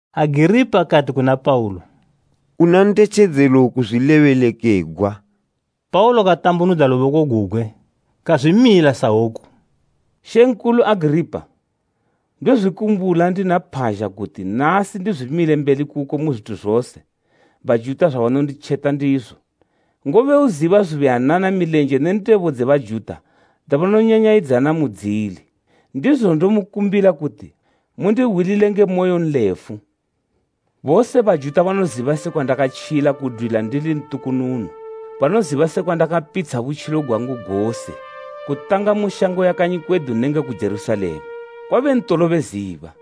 Agiripa kati kuna Paulo, “Una ndetjedzelo kuzwilebelekegwa.” Paulo katambunudza luboko gugwe kazwimila sahwoku: “Mambo Agiripa! Ndozwikumbula ndina phazha kuti nasi ndizwimile mbeli kuko mu zwithu zose Bajuta zwabanonditjeta ndizo, ngobe uziba zubuyanana milenje ne ndebo dze Bajuta dzabanonyanyayidzana mudzili. Ndizo ndomukumbila kuti mundihwilile nge moyonlefu. “Bose Bajuta banoziba sekwa ndakatjila kudwila ndili ntukununu. Banoziba sekwa ndakapitsha butjilo gwangu gose, kutanga mu shango ya kanyi kwedu nenge ku Jerusalema. Kwabe ntolo beziba,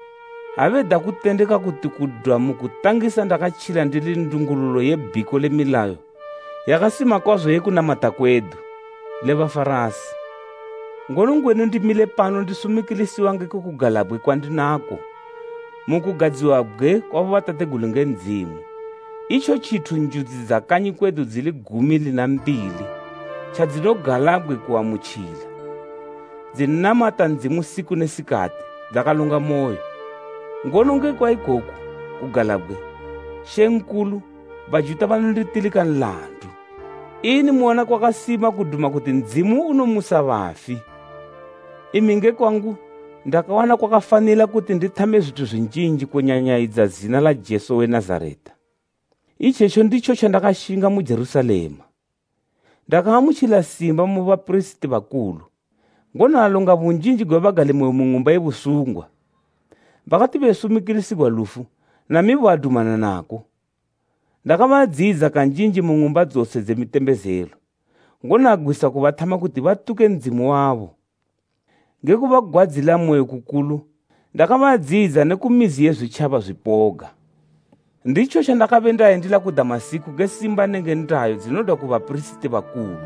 ha beda kutendeka kuti kudwa mu kutangisa ndakatjila ndili ndungululo ye bhiko le milayo yakasima kwazo ye kunamata kwedu, le Bafarasi. Ngono ngwenu ndimile pano ndisumikilisiwa ngekwe kugalabgwe kwandinako mu kugadziwabgwe kwa bobatategulu nge Ndzimu, itjo tjithu njudzi dza kanyi kwedu dzili gumi lina mbili tjadzinogalabgwe kuamutjila, dzinamata Ndzimu siku ne sikati dzakalongamoyo. Ngono ngekwa ikoku kugalabgwe, Mambo, Bajuta banonditilika nlandu! Ini muwana kwakasima kuduma kuti Ndzimu unomusa bafi? “Imi nge kwangu ndakawana kwakafanila kuti ndithame zwithu zwinjinji kunyanyayidza zina la Jesu we Nazareta. Itjetjo nditjo tjandakashinga mu Jerusalema. Ndakaamutjila simba mu bapirisiti bakulu, ngono alonga bunjinji gwe bagalimoyo mu ng'umba ye busungwa; bakati besumikilisigwa lufu, namibo adumana nako. Ndakabadziyidza kanjinji mu ng'umba dzose dze mitembezelo, ngono agwisa kubathama kuti batuke Ndzimu wabo. Nge kubagwadzilamoyo kukulu, ndakabadziyidza ne ku mizi ye zwitjaba zwipoga. “Nditjo tjandakabendayendila ku Damasiko nge simba nenge ndayo dzinodwa mu bapirisiti bakulu.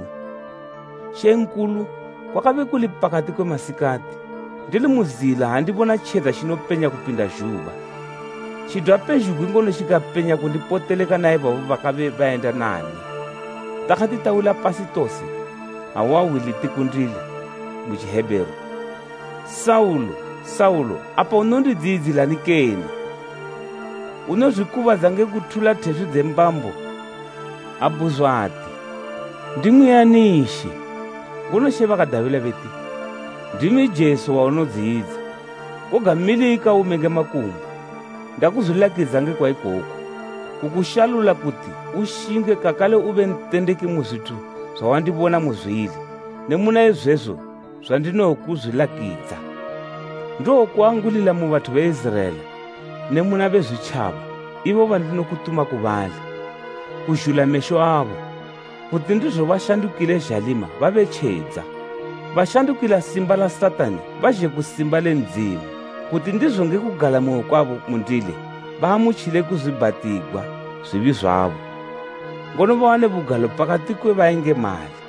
Mambo, kwakabe kuli pakati kwe masikati, ndili mu zila ha ndibona tjedza tjinopenya kupinda zhuba, tjidwa pezhugwi ngono tjikapenya kundipoteleka na ibabo bakabe bayenda nami. Takati tawila pasi tose, ahwa hwi liti kundili mu Tjihebheru, ‘Saulo, Saulo! Apa unondidziyidzilani kene? Unozwikubadza nge kuthula theswi dze mbambo.’ Abhuzwa ati, ‘Ndimwi ani She?’ Ngono She bakadabila beti, ‘Ndimi Jesu, waunodziyidza. Koga milika ume nge makumbo. Ndakuzwilakidza ngekwa ikoku, kukushalula kuti ushinge kakale ube ntendeki mu zwithu zwawandibona muzwili ne muna izwezo zwandinowokuzwilakidza. Ndowokuangulila mu bathu be Iziraela ne muna Bezwitjaba ibo bandinokutuma ku bali, kuzhula mesho abo, kuti ndizo bashandukile zhalima babe tjedza. Bashandukila simba la Satani bazhe ku simba le Ndzimu, kuti ndizo nge kugalamoyo kwabo mundili baamutjile kuzwiibhatigwa zwibi zwabo, ngono bawane bugalo pakati kwe bayengemali.’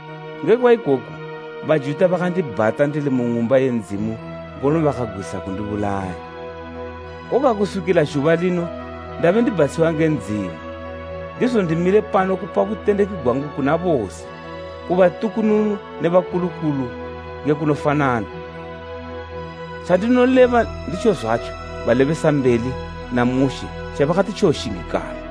Ngekwa ikoku Bajuta bakandibhata ndili mu Ng'umba ye Ndzimu ngono bakagwisa kundibulaya. Koga kuswikila zhuba lino ndabe ndibhatshiwa nge Ndzimu, ndizo ndimile pano kupa butendeki gwangu kuna bose, ku batukununu ne bakulukulu nge kunofanana. Tjandinoleba nditjozwatjo balebesambeli na Mushe tjabakati tjowoshingikala,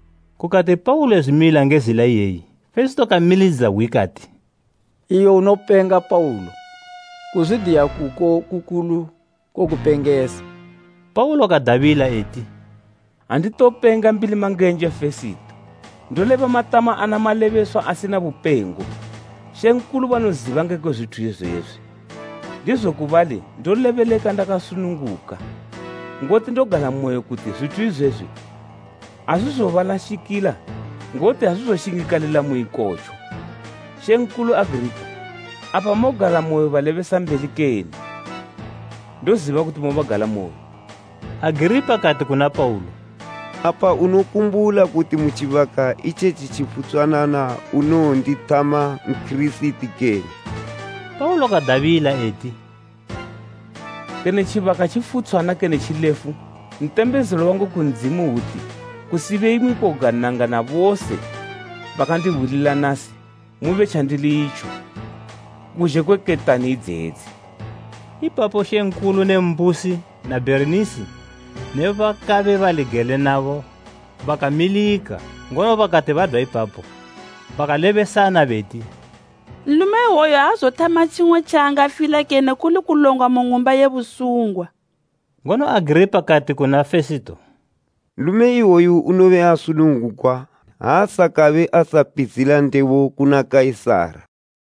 Kukati Paulo ezwimila nge zila iyeyi, Fesito kamilidza hwi kati “Iwe unopenga Paulo! Kuzwidiya kuko kukulu kokupengesa!” Paulo kadabila eti, “Anditopenga Mbilimangenje Fesito! Ndoleba matama ana malebeswa asina bupengo. Mambo banoziba ngekwe zwithu izwezwi, ndizo ku bali ndolebeleka ndakasununguka, ngoti ndogalamoyo kuti zwithu izwezwi azwizobalashikila ngoti azwizoshingikalila mu ikotjo. Mambo Agiripa, apa mogalamoyo balebesambeli kene? Ndoziba kuti mobagalamoyo!” Agiripa kati kuna Paulo, “Apa unokumbula kuti mu tjibaka itjetji tjifutshwanana unowondithama Nkirisiti kene?” Paulo kadabila eti, “Kene tjibaka tjifutshwana kene tjilefu, ntembezelo wangu ku Ndzimu hwuti kusibe imwi koga nanga na bose makandihwilila nasi, mube tjandili itjo, kuzhe kwe ketani idzedzi!” Ipapo mambo ne mbusi na Bherinisi ne bakabe bali gele nabo bakamilika, ngono bakati badwa ipapo, bakalebesana beti, “Nlume iwoyu aazothama tjimwe tjaangafila kene kuli kulongwa mu ng'umba ye busungwa.” Ngono Agiripa kati kuna Fesito, “Nlume iwoyu unobe asunungugwa ha asakabe asapitshila ndebo kuna Kaisara.”